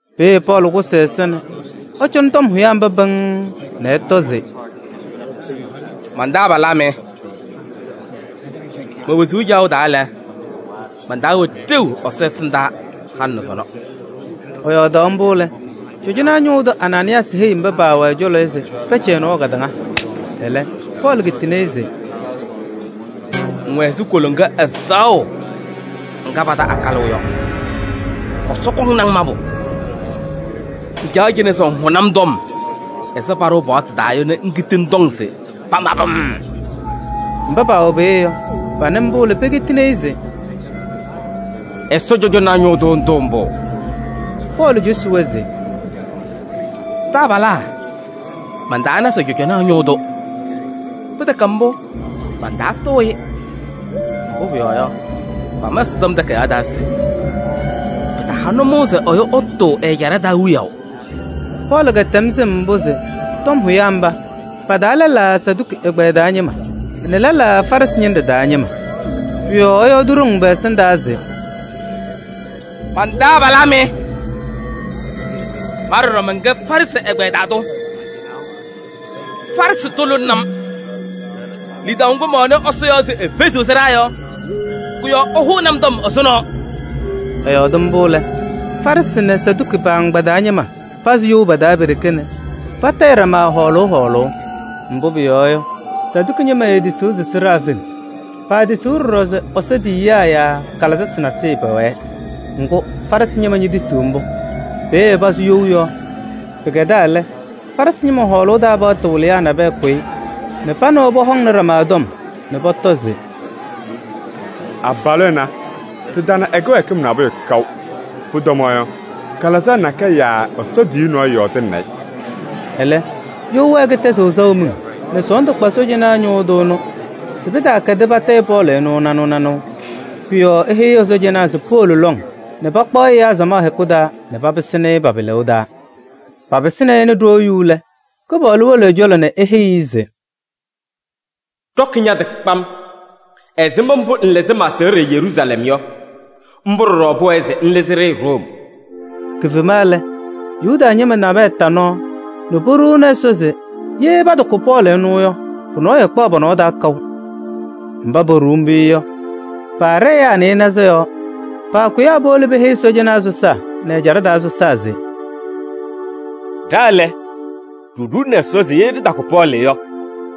Peeye Pɔɔlɩ kʋsɩ ɛza nɛ ɛcɔnɩ tɔm hʋyaa mba pɩŋŋ nɛ ɛtɔ se: “Man-taabalaa mɩ! Me-wezuu caɣʋ taa lɛ, man-taa wɛ ɖeu Ɛsɔ ɛsɩndaa halɩ nɛ sɔnɔ.” Ɛyɔɔdaɣ mbʋ lɛ, cɔjɔnaa ñʋʋ tʋ Anaanɩyaasɩ heyi mba paawɛ ɛ-cɔlɔ yɔ se pɛcɛ ɛ-nɔɔ kadaŋa. Ɛlɛ Pɔɔlɩ kitini-i se: “Ŋwɛ ɛzɩ koloŋa ɛzaɣʋ ŋga pata akalʋʋ yɔ, Ɛsɔ kɔŋnɩ-ŋ mabʋ! Ŋcaɣ cɩnɛ se ŋhʋnɩ-m tɔm ɛzɩ paɖʋʋ paɣtʋ taa yɔ nɛ ŋkiti ŋtɔŋ se pamabɩ-m!” Mba paawɛ peeye yɔ, panɩ mbʋ lɛ, pekitini-i se: “Ɛsɔ cɔjɔnaa ñʋʋ tʋ ŋtʋʋ mbʋ?” Pɔɔlɩ cosi-wɛ se: “Taabalaa! Mantaana se cɔjɔnaa ñʋʋ tʋ. Pɩtɛkɛ mbʋ, mantaatʋʋ-ɩ. Mbʋ pʋyɔɔ yɔ, pama Ɛsɔtɔm Takayaɣ taa se: ‘Pɩtaha nʋmɔʋ se ɛyʋ ɛtʋʋ ɛ-ɛjaɖɛ taa wiyaʋ.’” Pɔɔlɩ kɛtɛm sɩm mbʋ se tɔm hʋyaa mba, pa-taa lɛlaa Saduki ɛgbɛyɛ taa ñɩma nɛ lɛlaa Farɩsɩ ñɩnɖɛ taa ñɩma. Pʋ-yɔɔ ɛyɔɔdɩ ɖoŋ pɛ-ɛsɩndaa se: “Man-taabalaa mɩ! Ma ɖɔɖɔ mɛnkɛ Farɩsɩ ɛgbɛyɛ taa tʋ, Farɩsɩ tʋ lʋlɩnɩ-m. Lidaʋ ŋgʋ mɛwɛnɩ Ɛsɔ yɔɔ se efeziɣ sɩɖaa yɔ, kʋ-yɔɔ ɩhʋʋnɩ-m tɔm ɛzʋnɔ.” Ɛyɔɔdɩ mbʋ lɛ, Farɩsɩ nɛ Saduki pa-agbaa taa ñɩma pazɩ you pa-taa pe-ɖeke nɛ patayɩ ɖama hɔɔlʋʋ hɔɔlʋʋ. Mbʋ pʋyɔɔ yɔ, Saduki ñɩma eetisiɣ se sɩɖaa feŋ. Paatisiɣ ɖɔɖɔ se Ɛsɔ tiyiyaa yaa kalɩzasɩ nasɩyɩ pɛwɛɛ. Ŋgʋ, Farɩsɩ ñɩma ñetisiɣ mbʋ. Peeye pasʋ you yɔɔ. Pɩkɛdaa lɛ, Farɩsɩ ñɩma hɔɔlʋʋ taa paɣtʋ wɩlɩyaa nabɛyɛ kʋyɩ nɛ pa nɛ wɛ pɔhɔŋnɩ ɖama tɔm nɛ pɔtɔ se: “Abalʋ ɛnɛ, ɖɩtana ɛ-kɩwɛɛkɩm nabʋyʋ kaʋ. Pʋtɔmaɣ yɔ, kalɩzaɣ nakɛyɛ yaa Ɛsɔ tiyiyu nɔɔyʋ yɔɔdɩnɩnɩ-ɩ.” Ɛlɛ, you wɛɛ kɩtɛzɩɣ saʋ miŋ nɛ sɔɔndʋ kpa sɔɔjanaa ñʋʋ tʋ ɛnʋ se pɩtaakɛdɩ patayɩ Pɔɔlɩ ɛnʋ nanʋʋ nanʋʋ. Pʋ-yɔɔ eheyi ɛ-sɔɔjanaa se powolo lɔŋ nɛ pakpaɣ-ɩ ɛyaa samaɣ hɛkʋ taa nɛ papɩsɩnɩ-ɩ pa-pɩlʋʋ taa. Papɩsɩnɩ-ɩ nɛ ɖoo yu lɛ, Kɩpaɣlʋ wolo ɛ-cɔlɔ nɛ eheyi-i se: “Ɖɔkɩ ña-tɩ kpam! Ɛzɩma mbʋ ŋlɩzɩ ma-aseɣɖe Yeruusalɛm yɔ, mbʋ ɖɔɖɔ pʋwɛɛ se ŋlɩzɩ-ɖɩ Room.” Kifema lɛ, Yuda ñɩma nabɛyɛ ta nɔɔ nɛ poɖuuni Ɛsɔ se ye patakʋ Pɔɔlɩ ɛnʋ yɔ, pʋyʋ nɔɔyʋ ɛɛkpaɣ pɔ-nɔɔ taa kaʋ. Mba poɖuu mbʋ yɔ, paaɖɛ ɛyaa nɩɩnaza yɔɔ. Paakʋyaa powolo peheyi cɔjɔnaa sɔsaa nɛ ɛjaɖɛ taa sɔsaa se: “Ɖa lɛ, ɖiɖuuni Ɛsɔ se ye ɖɩtakʋ Pɔɔlɩ yɔ,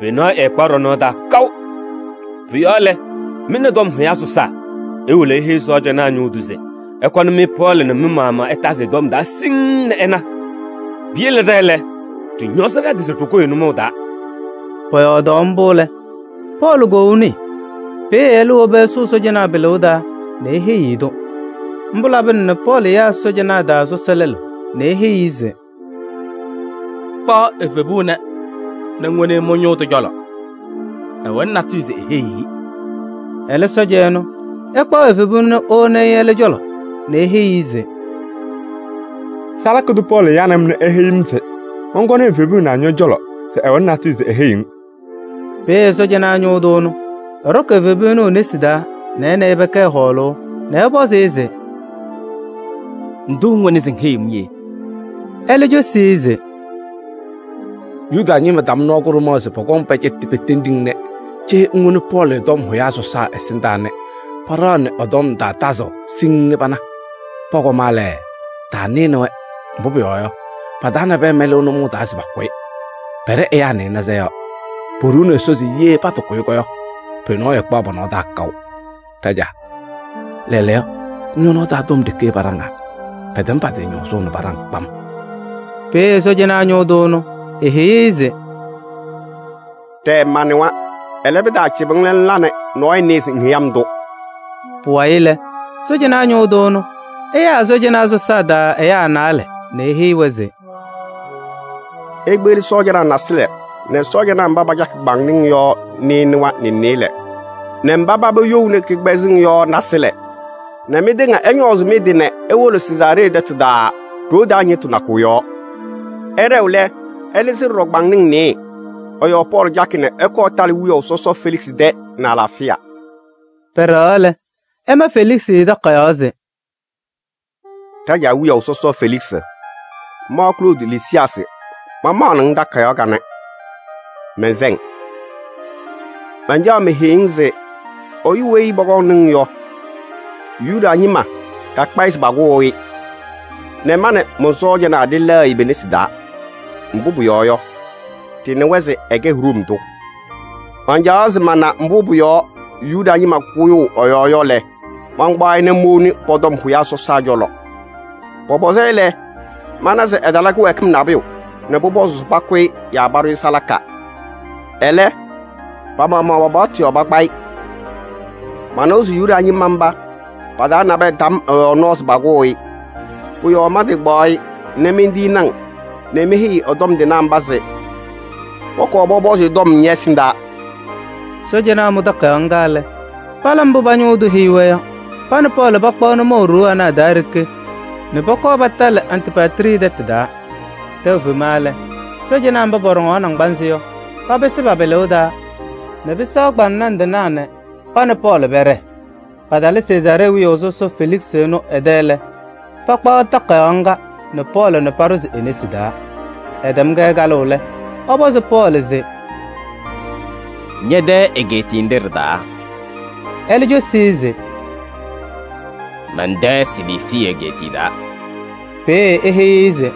pʋyʋ nɔɔyʋ ɛɛkpaɣ ɖɔ-nɔɔ taa kaʋ. Pʋ-yɔɔ lɛ, mɩ nɛ tɔm hʋyaa sɔsaa iwolo iheyi sɔɔjanaa ñʋʋ tʋ se ɛkɔnɩ-mɩ Pɔɔlɩ nɛ mɩ-maɣmaɣ ɩtazɩ ɛ-tɔm taa siŋŋ nɛ ɩna. Piyele ɖa lɛ, ɖɩñɔɔzɩ ɖa-tɩ se ɖɩkʋʋ-ɩ nʋmɔʋ taa.” Pɔyɔɔdaɣ mbʋ lɛ, Pɔɔlɩ koou nɩɩ. Peeye ɛlɛ wobi ɛsʋʋ sɔɔjanaa pɩlʋʋ taa nɛ eheyi-i-tʋ. Mbʋ labɩna nɛ Pɔɔlɩ yaa sɔɔjanaa taa sɔsɔ lɛlʋ nɛ eheyi-i se: “Kpaɣ evebu ɛnɛ nɛ ŋwoni-i mɩ-ñʋʋ tʋ cɔlɔ, ɛwɛnɩ natʋyʋ se eheyi-i.” Ɛlɛ sɔɔja ɛnʋ, ɛkpaɣ evebu ɛnʋ nɛ ewoni-i ɛlɛ cɔlɔ nɛ eheyi-i se: “Salaka tʋ Pɔɔlɩ yanɩ-m nɛ eheyi-m se mɔnkɔnɩ evebu ɛnɛ ñɔ-cɔlɔ se ɛwɛnɩ natʋyʋ se eheyiɣ-ŋ.” Peeye sɔɔjanaa ñʋʋ tʋ ɛnʋ, ɛɖɔkɩ evebu ɛnʋ e-nesi taa nɛ ɛ nɛ ɩ pɛkɛɛ hɔɔlʋʋ nɛ ɛpɔzɩ-ɩ se: “Ndʋ ŋwɛnɩ se ŋheyiɣ-m yee?” Ɛlɛ cosi-i se: “Yuda ñɩma tam nɔɔ kʋɖʋmaɣ se pɔkɔŋ pɛcɛtɩ petendi-ŋ nɛ cee ŋwoni Pɔɔlɩ tɔm hʋyaa sɔsaa ɛsɩndaa nɛ paɖaɣnɩ ɛ-tɔm taa tazʋʋ siŋŋ nɛ pana. Pɔkɔma lɛ, taanɩnɩ-wɛ, mbʋ pʋyɔɔ yɔ, pa-taa nabɛyɛ mɛlɩɣ nʋmɔʋ taa se pakʋ-ɩ. Pɛɖɛ ɛyaa nɩɩnaza yɔɔ. Poɖuuni Ɛsɔ se ye patakʋ-ɩ yɔ, pʋyʋ nɔɔyʋ ɛɛkpaɣ pɔ-nɔɔ taa kaʋ. Ɖajaa, lɛɛlɛɛyɔ ñɔ-nɔɔ taa tɔm ɖeke paɖaŋaa. Pɛtɛm pa-tɩ ñɔɔzʋʋ nɛ paɖaŋ kpam.” Peeye sɔɔjanaa ñʋʋ tʋ ɛnʋ eheyi-i se: “Ɖɛɛ! Manɩwa. Ɛlɛ, pɩtaacɩbɩ-ŋ nɛ ŋla nɛ nɔɔyʋ nɩɩ se ŋheyi-m-tʋ.” Pʋwayɩ lɛ, sɔɔjanaa ñʋʋ tʋ ɛnʋ, ɛyaa ɛ-sɔɔjanaa sɔsaa taa ɛyaa naalɛ nɛ eheyi-wɛ se: “Ikpeɣli sɔɔjanaa naasɩlɛ nɛ sɔɔjanaa mba pacakɩ kpaŋnaŋ yɔ nɩɩnʋwa nɛ nɩɩlɛ nɛ mba paba youni kɩkpɛzɛmɩŋ yɔ naasɩlɛ nɛ mɩtɩŋa ɩñɔɔzɩ mɩ-tɩ nɛ iwolo Sezaaree tɛtʋ taa ɖoo taa ñɩɣtʋ nakʋ yɔɔ. Ɩɖɛɣ lɛ, ɩlɩzɩ ɖɔɖɔ kpaŋnaŋ nɩɩyɩ. Ɩ-yɔɔ Pɔɔlɩ cakɩ nɛ ɛkɔɔ ɛtalɩ wiyaʋ sɔsɔ Feliksɩ tɛ nɛ ɛ-alaafɩya.” Pɛɖɛɣaɣ lɛ, ɛma Feliksɩ takayaɣ se: “Ɖajaa wiyaʋ sɔsɔ Feliksɩ! Ma Kloodi Lisiyaasɩ mamaɣnɩ-ŋ takayaɣ kanɛ, mɛnsɛ-ŋ! Mancaɣ meheyi-ŋ se ɛyʋ weyi pɔkɔŋnɩ-ŋ yɔ, Yuda ñɩma kakpa-ɩ se pakʋʋ-ɩ nɛ ma nɛ mɔn-sɔɔjanaa ɖɩlɛɣ-ɩ pe-nesi taa. Mbʋ pʋyɔɔ yɔ, ɖɩnɩwa se ɛkɛ Room tʋ. Mancaɣaɣ se mana mbʋ pʋ-yɔɔ Yuda ñɩma kʋyʋʋ ɛ-yɔɔ yɔ lɛ, mankpaɣ-ɩ nɛ mowoni pɔ-tɔm hʋyaa sɔsaa cɔlɔ. Pɔpɔzɩ-ɩ lɛ, mana se ɛtala kɩwɛɛkɩm nabʋyʋ nɛ pʋpɔzʋʋ se pakʋ-ɩ yaa paɖʋ-ɩ salaka. Ɛlɛ, pa-maɣmaɣ pa-paɣtʋ yɔɔ pakpa-ɩ. Manɩwa se Yuda ñɩma mba pa-taa nabɛyɛ tam ɛ-yɔɔ nɔɔ se pakʋʋ-ɩ. Pʋ-yɔɔ mantɩkpaɣ-ɩ nɛ mentiyini-ŋ nɛ meheyi ɛ-tɔm tɩnaa mba se pɔkɔɔ pɔpɔzɩ-ɩ tɔm ñɛ-ɛsɩndaa!” Sɔɔjanaa mʋ takayaɣ ŋga lɛ, pala mbʋ pa-ñʋʋ tʋ heyi-wɛ yɔ: pa nɛ Pɔɔlɩ pakpaɣ nʋmɔʋ ɖoo ana a-taa ɖeke nɛ pɔkɔɔ patalɩ Antipatrii tɛtʋ taa. Tɛʋ fema lɛ, sɔɔjanaa mba pɔɖɔŋaɣ naŋgbanzɩ yɔ, papɩsɩ pa-pɩlʋʋ taa nɛ pɩsɛɣ kpaŋnaŋ tɩnaa nɛ pa nɛ Pɔɔlɩ pɛɖɛɛ. Patalɩ Sezaaree wiyaʋ sɔsɔ Feliksɩ ɛnʋ ɛ-tɛ lɛ, pakpaɣ takayaɣ ŋga nɛ Pɔɔlɩ nɛ paɖʋzɩ e-nesi taa. Ɛtɛm-kɛ kalʋʋ lɛ, ɛpɔzɩ Pɔɔlɩ se: “Ñɛ-tɛ egeetiye nɖɩ ɖɩ-taa?” Ɛlɛ cosi-i se: “Mɛn-tɛ Siliisii egeetiye taa.” Peeye eheyi-i se: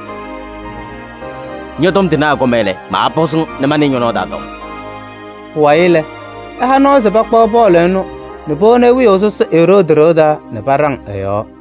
“Ñɔ-tɔm tɩnaa ɛkɔma lɛ, maapɔzɩ-ŋ nɛ manɩɩ ñɔ-nɔɔ taa tɔm.” Pʋwayɩ lɛ, ɛha nɔɔ se pakpaɣ Pɔɔlɩ ɛnʋ nɛ powoni-i wiyaʋ sɔsɔ Eroodi ɖɩɣa taa nɛ paɖaŋ ɛ-yɔɔ.